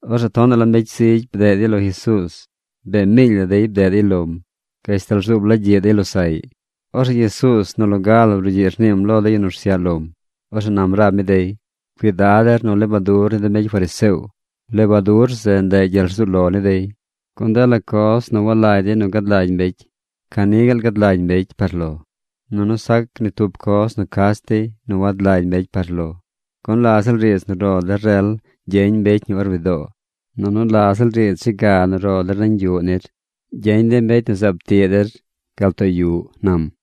Orzeꞌ tonaꞌ la mbecy zigy bdeꞌ dey lo Jesuuz. Bee miily la dey bdeꞌ dey lom gashtal rzuub la gyiꞌ dey losaꞌy. Orzeꞌ Jesuuz nu loga la brugyiꞌ rniim lo de yu nu rsyaꞌ lom. Orzeꞌ nam rab mi dey: ―Cuidad der nu lebadur ni de mbecy fariseo. Lebadur zeꞌ, ndeꞌ gyel rzuu lo ni dey. Gun dela coz nu walagy dey nu gad lagy mbecy, ca ni gaal gad lagy mbecy par lo. Nunu sac ni tub coz nu cach dey nu wad lagy mbecy par lo. Gun la ziꞌl riidz nu ro der rel gyeñ mbecy ñi or widoo. Nunu la ziꞌl riidz dze ga nu ro der nañ yuꞌ nir, gyeñ de mbecy nu zaab tiꞌ riidz zeꞌ gal too yuꞌ ―nam―.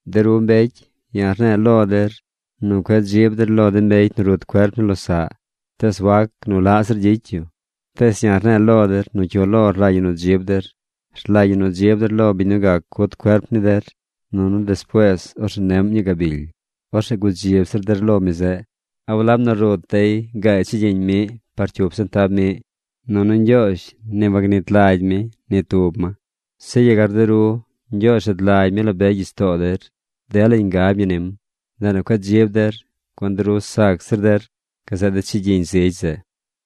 ’De ru mbecy, ya̱ rne̱e̱ lo der nu cueꞌ dzib der lo de mbecy nu rut cuerp ni losaꞌ, tees wac nu laꞌ zir gyicy yu. Tees ya̱ rne̱e̱ lo der nu cyu lo rlagy ñi nu dzib der. Rlagy ñi nu dzib der lo biñ nu gac cut cuerp ni der, nunu despuees orzeꞌ neꞌm ñii gabily. Orzeꞌ gudzib zir der lo mi zeꞌ. ’¿A walab nu rut dey gaay chigyiñ miꞌ par cyup sentab miꞌ? Nunu Ñgyoozh ni wagnit lagy mi ni tub ma. Zeꞌ yegar de ru. Ñgyoozh rad lagy mi la be gyich too der. Delañ ngab ñi nim. Ndeꞌ nu cueꞌ dzib der, gun de ru sac zir der gazeꞌ de chigyiñ zigy zeꞌ.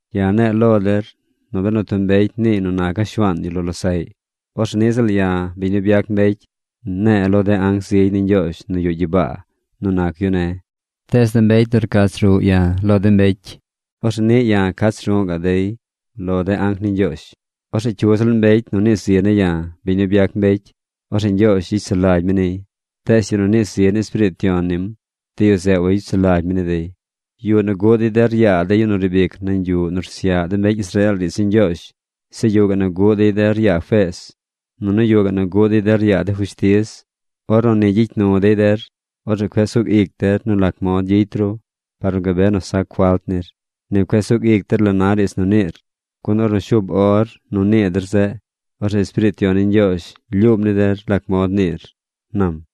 ’Ya̱ ne̱e̱ lo der nu benu tub mbecy niiy nu naca̱ Shuaan yu lo losaꞌy, orzeꞌ niꞌ ziꞌl ya̱, biñ nu byac mbecy, ne̱e̱ lo de anc zigy ni Ñgyoozh nu yuꞌ gyibaa nu nac yu ne̱. Tees de mbecy nu rcach ruꞌ ya̱ lo de mbecy, orzeꞌ niꞌ ya̱ cach ru̱ꞌ ga̱ꞌ dey lo de anc ni Ñgyoozh. ’Orzeꞌ cyu ziꞌl mbecy nu nii zi ne̱ ya̱, biñ nu byac mbecy, orzeꞌ Ñgyoozh gyicy sulagy mi niy. Tees de yu nu nii zi ni Espiriit Yon nim, de yu zeꞌ wayicy sulagy mi ni dey. ’Yuꞌ nu guꞌ dey der yaa de yu nu riib ic nañ yuꞌ nu rsyaꞌ de mbecy Israeel riidz ni Ñgyoozh. Zeꞌ yuꞌ gaꞌ nu guꞌ dey der yaa feez. Nunu yuꞌ gaꞌ nu guꞌ dey der yaa de fushtiz. Ornu ni gyicy nu dey der, orzeꞌ cueꞌ sug ic der nu lac mod gyicy ru par nu gabe nu sac falt nir. Ni cueꞌ sug ic der la na riidz nu niir. Gun ornu shuub or nu nii der zeꞌ, orzeꞌ Espiriit Yon ni Ñgyoozh lyuum ni der lac mod niir ―nam.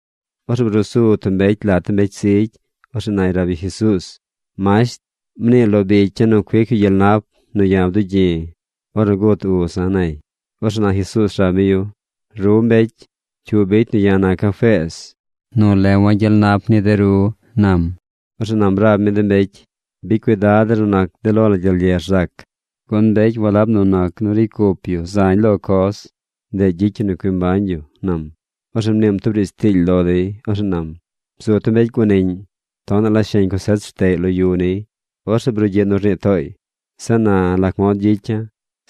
Orzeꞌ bruu su tub mbecy lat de mbecy zigy. Orzeꞌ nay rab yu Jesuuz: ―Masht, mnii lo bicya̱ nu cuic yu gyel nap nu ya̱ bdugyi̱ ornu gut uza̱ ―nay. Orzeꞌ na Jesuuz rab mi yu: ―Ru mbecy, ¿cyu bicy nu ya̱ naca̱ feez nu lewa̱ gyel nap ni de ru? ―nam. Orzeꞌ nam rab mi de mbecy: ―Bicy cuidad der nu nac de lo la gyel ye rzac. Gun mbecy walab nu nac nu ricy cup dey zañ lo coz, ndeꞌ gyicy ñi nu cui mbañ yu ―nam. Orzeꞌ mniim tub riidz tiily lo dey. Orzeꞌ nam: ―Bzu tub mbecy guaniꞌñ. Tonaꞌ la sheñ cosech rteꞌy lo yu niy. Orzeꞌ brugyiꞌ nu rnii tooy: “¿Zeꞌ na lac mod gyicya̱?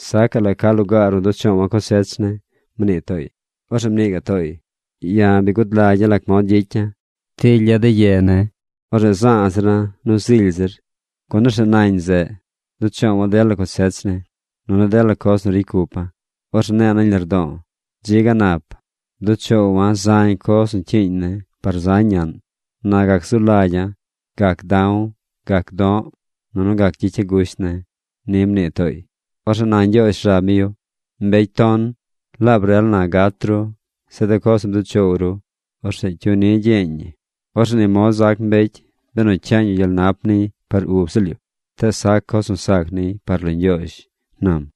Sacaꞌ la ca lugaar nu duꞌ choowa̱ cosech ne̱”, mnii tooy. Orzeꞌ mnii gaꞌ tooy: “Ya̱ bi gud lagya̱ lac mod gyicya̱. Tilya̱ de ye ne̱. Orzeꞌ za̱a̱ zira̱ nu zily zir. Gun orzeꞌ nañ zeꞌ duꞌ choowa̱ dela cosech ne̱, nunu dela coz nu ricy cupa̱. Orzeꞌ ne̱e̱ nañ lardo̱o̱: Dzi ga nap. Bduꞌ choowa̱ zañ coz nu cyiiñ ne̱ par zañ ñaꞌn. Na gac zu lagya̱. Gac da̱w. Gac do̱ꞌ. Nunu gac gyicya̱ gusht ne̱.” Ni mnii tooy. Orzeꞌ na Ñgyoozh rab mi yu: “¡Mbecy ton! Laab rel na gat ru. Zeꞌ de coz nu bduꞌ choow ru, orzeꞌ ¿cyu ni gyeñ ñi?” Orzeꞌ ni mod zac mbecy benu cyaañ yu gyel nap niy par ub ziꞌl yu, tees sac coz nu sac niy par lo Ñgyoozh ―nam.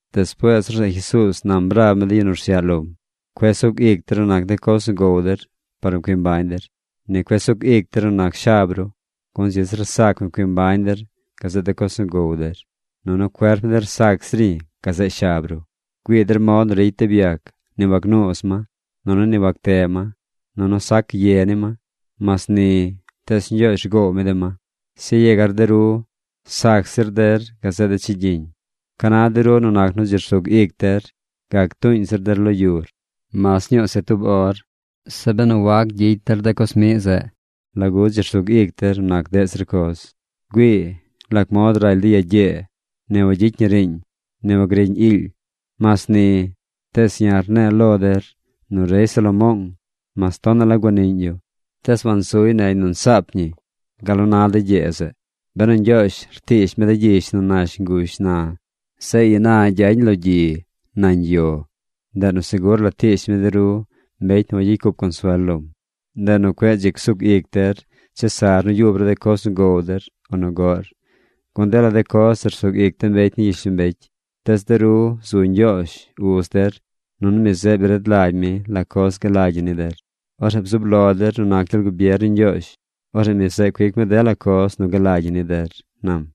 Despuees orzeꞌ Jesuuz nam rab mi de yu nu rsyaꞌ lom: ―Cueꞌ sug ic der nu nac de coz nu gow der par nu cui mbañ der. Ni cueꞌ csug ic der nu nac shab ru. Gun dzi zir sac nu cui mbañ der gazeꞌ de coz nu gow der. Nunu cuerp ni der sac zir ñi gazeꞌ shab ru. Güii der mod nu ricy de byac. Ni wagnuuz ma. Nunu ni wagteꞌ ma. Nunu sac ye ni ma. Mas ni, tees Ñgyoozh rgoow mi de ma. ¡Zeꞌ yegar de ru sac zir der gazeꞌ de chigyiñ! ¿Ca na de ru nu nac nu dzi rsug ic der gac tuuñ zir der lo yur, mas ñuu se tub or? Zeꞌ benu wac gyicy der de coz miꞌ zeꞌ, ¿lagu dzi rsug ic der nu nac deꞌ zir coz? ’Güii lac mod raly de ya gyee. Ni wagyicy ñi riiñ. Ni wagriꞌñ iily. Mas ni, tees ya̱ rne̱e̱ lo der nu rey Salomoong, mas tonaꞌ la guaniꞌñ yu, tees wansuy negy nu nsaap ñi gal nu na de gyee zeꞌ. Benu Ñgyoozh rtiish mi de gyish nu nash ngush na, zeꞌ ina gyañ lo gyi nañ yo, ndeꞌ nu segur la tiish mi de ru mbecy nu wagyicy cup consuel lom. Ndeꞌ nu cueꞌ dzi csug ic der chesar nu yub ru de coz nu gow der o nu goꞌr. Gun dela de coz zeꞌ rsug ic de mbecy ni gyishlombecy. Tees de ru zu Ñgyoozh, uz der. Nunu mi zeꞌ bi rad lagy mi la coz galagy ñi ni der. Orzeꞌ bzub lo der nu nac gyel gubier ni Ñgyoozh. Orzeꞌ mi zeꞌ cuic mi dela coz nu galagy ñi ni der ―nam―.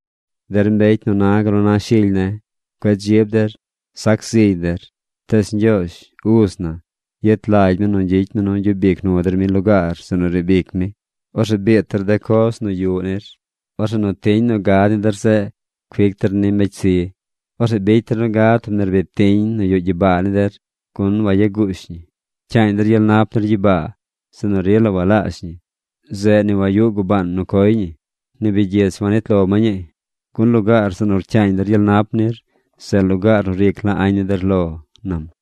’Der mbecy nu na gal nu na shily ne̱, cueꞌ dzib der. Sac zig der. Tees Ñgyoozh, uz na, yet lagy mi nu gyicy mi nu gyub ic nu der mi lugaar zeꞌ nu riib ic mi. Orzeꞌ biit der de coz nu yuꞌ nir. Orzeꞌ nu tiñ nu gad ni der zeꞌ cuic der ni mbecy zi. Orzeꞌ bicy der nu gad tub nerbid tiñ nu yuꞌ gyibaa ni der, gun wayaguush ñi. Pcyaañ der gyel nap nir gyibaa zeꞌ nu rila walaazh ñi. Zeꞌ ni wayuꞌ gubaan nu coy ñi, ni bigyich wac nit lo ma ñii. Gun lugaar zeꞌ nu rcyaañ der gyel nap nir, zeꞌ lugaar nu ric la añ ni der lo ―nam―.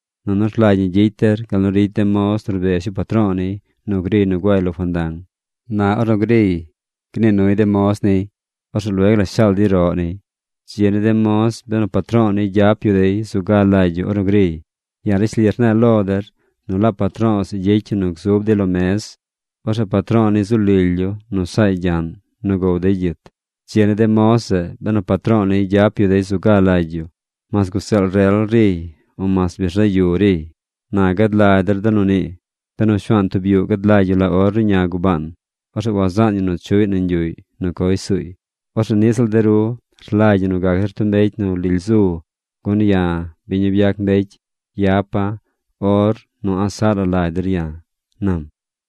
Nunu rlagy ñi gyicy der gal nu ricy de moz nu rbez yu patro̱o̱ niy nu griy nu guay lo fandang. Na ornu griy, gnii nuy de moz niy. Orzeꞌ lueg la shaal dey roꞌ niy. Dzi ni de moz benu patro̱o̱ niy gyap yu dey zu ga lagy yu ornu griy. Ya̱ rishli rne̱e̱ lo der nu laab patro̱o̱ zeꞌ gyicy yu nu gzub dey lo mez. Orzeꞌ patro̱o̱ niy zu lily yu nu saay gyaꞌn nu gow dey gyit. Dzi ni de moz zeꞌ benu patro̱o̱ niy gyap yu dey zu ga lagy yu mas guzeel rel riy, o mas bi rzaꞌ yu riy. Na gad lagy der de nu nii. Benu shuaan tub yuꞌ gad lagy yu la or ruꞌña gubaan, orzeꞌ wazaan yu nu chuꞌy nañ yuꞌy nu coy suuy. Orzeꞌ niꞌ ziꞌl de ru rlagy ñi nu gac der tub mbecy nu lily zu. Gun ya̱, biñ nu byac mbecy, yapa̱ or nu a̱ꞌ saꞌ la lagy der ya̱ ―nam.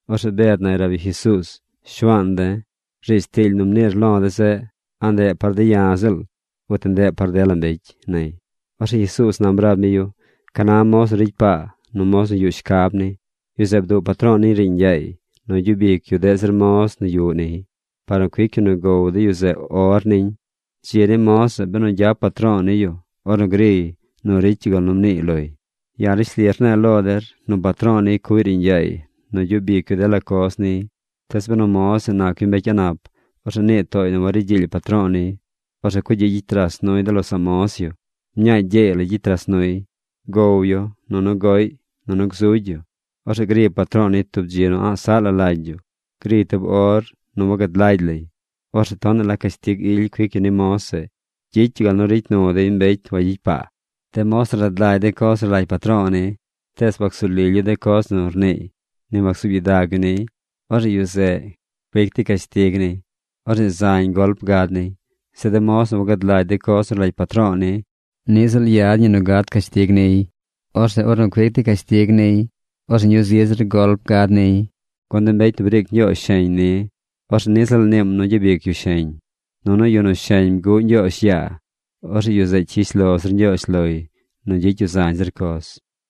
Orzeꞌ Bed nay rab yu Jesuuz: ―Shuaan de̱, riidz tiily nu mniir lo̱ de̱ zeꞌ, ¿a ndeꞌ par de̱ ya̱ ziꞌl, uti ndeꞌ par dela mbecy? ―nay. Orzeꞌ Jesuuz nam rab mi yu: ―¿Ca na moz nu ricy paa, nu moz nu yuꞌ shcab ñi? Yu zeꞌ bduꞌ patro̱o̱ niy riiñ yaay nu gyub ic yu deꞌ zir moz nu yuꞌ niy, par nu cuic yu nu gow de yu zeꞌ or niñ. Dzi ni moz zeꞌ benu gyap patro̱o̱ niy yu ornu griy nu ricy yu gal nu mniiy loy. Ya̱ rishli rne̱e̱ lo der nu patro̱o̱ niy cuꞌy riiñ yaay nu gyub ic yu dela coz niy. Tees benu moz zeꞌ nac yu mbecy a̱ꞌ nap, orzeꞌ nii tooy nu wari gyiily patro̱o̱ niy. Orzeꞌ cugyiꞌ gyicy ras nuy de losaꞌ moz yu. Mñaa gyeey la gyicy ras nuy. Gow yu nunu goꞌy, nunu gzugy yu. Orzeꞌ gri patro̱o̱ niy tub dzi nu a̱ꞌ saꞌ la lagy yu. Griy tub or nu wagad lagy lay. Orzeꞌ tonaꞌ la cashtig ily cuic yu ni moz zeꞌ. Gyicy yu gal nu ricy nu dey mbecy wagyicy paa. ’De moz nu rad lagy de coz nu rlagy patro̱o̱ ni, tees wacsu lily yu de coz nu rniiy, ni wacsuub gyidag yu niy, orzeꞌ yu zeꞌ, cuic dey cashtig niy. Orzeꞌ zañ golp gad niy. Zeꞌ de moz nu wagad lagy de coz nu rlagy patro̱o̱ ni, niꞌ ziꞌl yad ñi nu gad cashtig niy, orzeꞌ ornu cuic dey cashtig niy, orzeꞌ ñuu zi zir golp gad niy. Gun de mbecy nu briic Ñgyoozh sheñ ni, orzeꞌ niꞌ ziꞌl niim nu gyabic yu sheñ. Nunu yu nu sheñ bguꞌ Ñgyoozh yaa, orzeꞌ yu zeꞌ cyish lo zir Ñgyoozh loy nu gyicy yu zañ zir coz.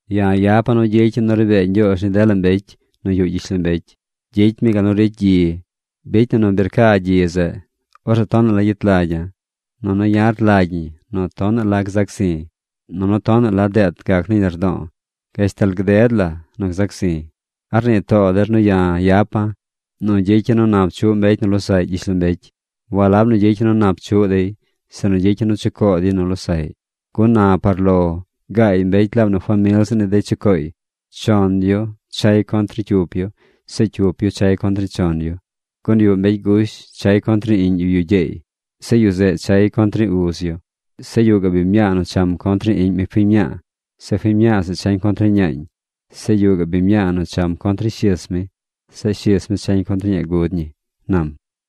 ’Ya̱ yapa̱ nu gyicya̱ nu ri bee Ñgyoozh ni dela mbecy nu yuꞌ gyishlombecy. Gyicy mi gal nu ricy gyi. Bicy na nu bi rca gyi zeꞌ, orzeꞌ tonaꞌ la gyet lagya̱. Nunu ya̱ rlagy ñi nu tonaꞌ la gzac zi̱. Nunu tonaꞌ la deet gac nañ lardo̱o̱ gashtal gded la nu gzac zi̱. ¿A rnii too der nu ya̱ yapa̱ nu gyicya̱ nu nap chuꞌ mbecy nu losaꞌy gyishlombecy? Walab nu gyicya̱ nu nap chuꞌ dey, sinu gyicya̱ nu chucoo dey nu losaꞌy. Gun na par lo gaay mbecy laab nu famil ziꞌl ni dey chucooy. Chon yu chay contr ni cyup yu. Zeꞌ cyup yu chay contr ni chon yu. Gun yuꞌ mbecy gush nu chay contr ni iꞌñ yu yu gyeey. Zeꞌ yu zeꞌ chay contr ni uz yu. Zeꞌ yuꞌ gaꞌ biñ mñaa nu cham contr ni iꞌñ mi fiñ mñaa. Zeꞌ fiñ zeꞌ chañ contr ni ñaañ. Zeꞌ yuꞌ gaꞌ biñ mñaa nu cham contr ni shis mi. Zeꞌ fiñ zeꞌ chañ contr ni ñaa gud ñi ―nam.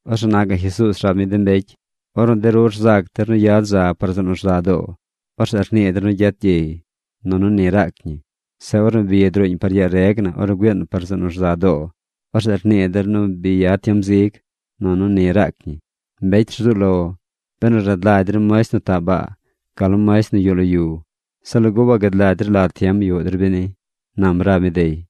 Orzeꞌ na gaꞌ Jesuuz rab mi de mbecy: ―Ornu de ru rzac der nu yad za par zeꞌ nu rza doo, orzeꞌ rnii der nu gyet gyey. Nunu ni raac ñi. Zeꞌ ornu bi druuñ par yaa reg na ornu güiin par zeꞌ nu rza doo, orzeꞌ rnii der nu bi yad tiem zig. Nunu ni raac ñi. ¡Mbecy rzuꞌ lo! Benu rad lagy der muesht nu taꞌ baa, gal nu muesht nu yuꞌ lo yu, ¿se lagu wagad lagy der la tiem yuꞌ der beni? ―nam rab mi dey.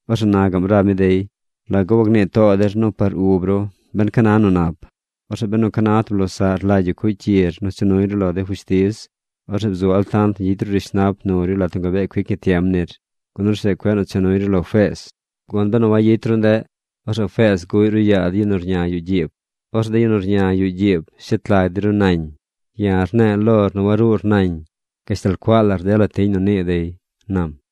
Orzeꞌ na gaꞌm rab mi dey: ―¿Lagu wagnii too der par ub ru ben ca na nu nap? Orzeꞌ benu ca na tub losaꞌr rlagy yu cuꞌy cyir nu cha nuy ru lo de fushtiz, orzeꞌ bzu altant nu gyicy ru rishnap nur yu lat nu gabee cuic ñi tiem nir. Gun orzeꞌ cueꞌ cha nuy ru lo feez. Gun benu wayicy ru ndeꞌ, orzeꞌ feez zeꞌ guꞌy ru yaa de yu nu rña yuꞌ gyiib. Orzeꞌ de yu nu rña yuꞌ gyiib shet lag dey ru nañ. Ya̱ rne̱e̱ lor nu waruur nañ gashtal cuaa lar dela tiñ nu nii dey ―nam.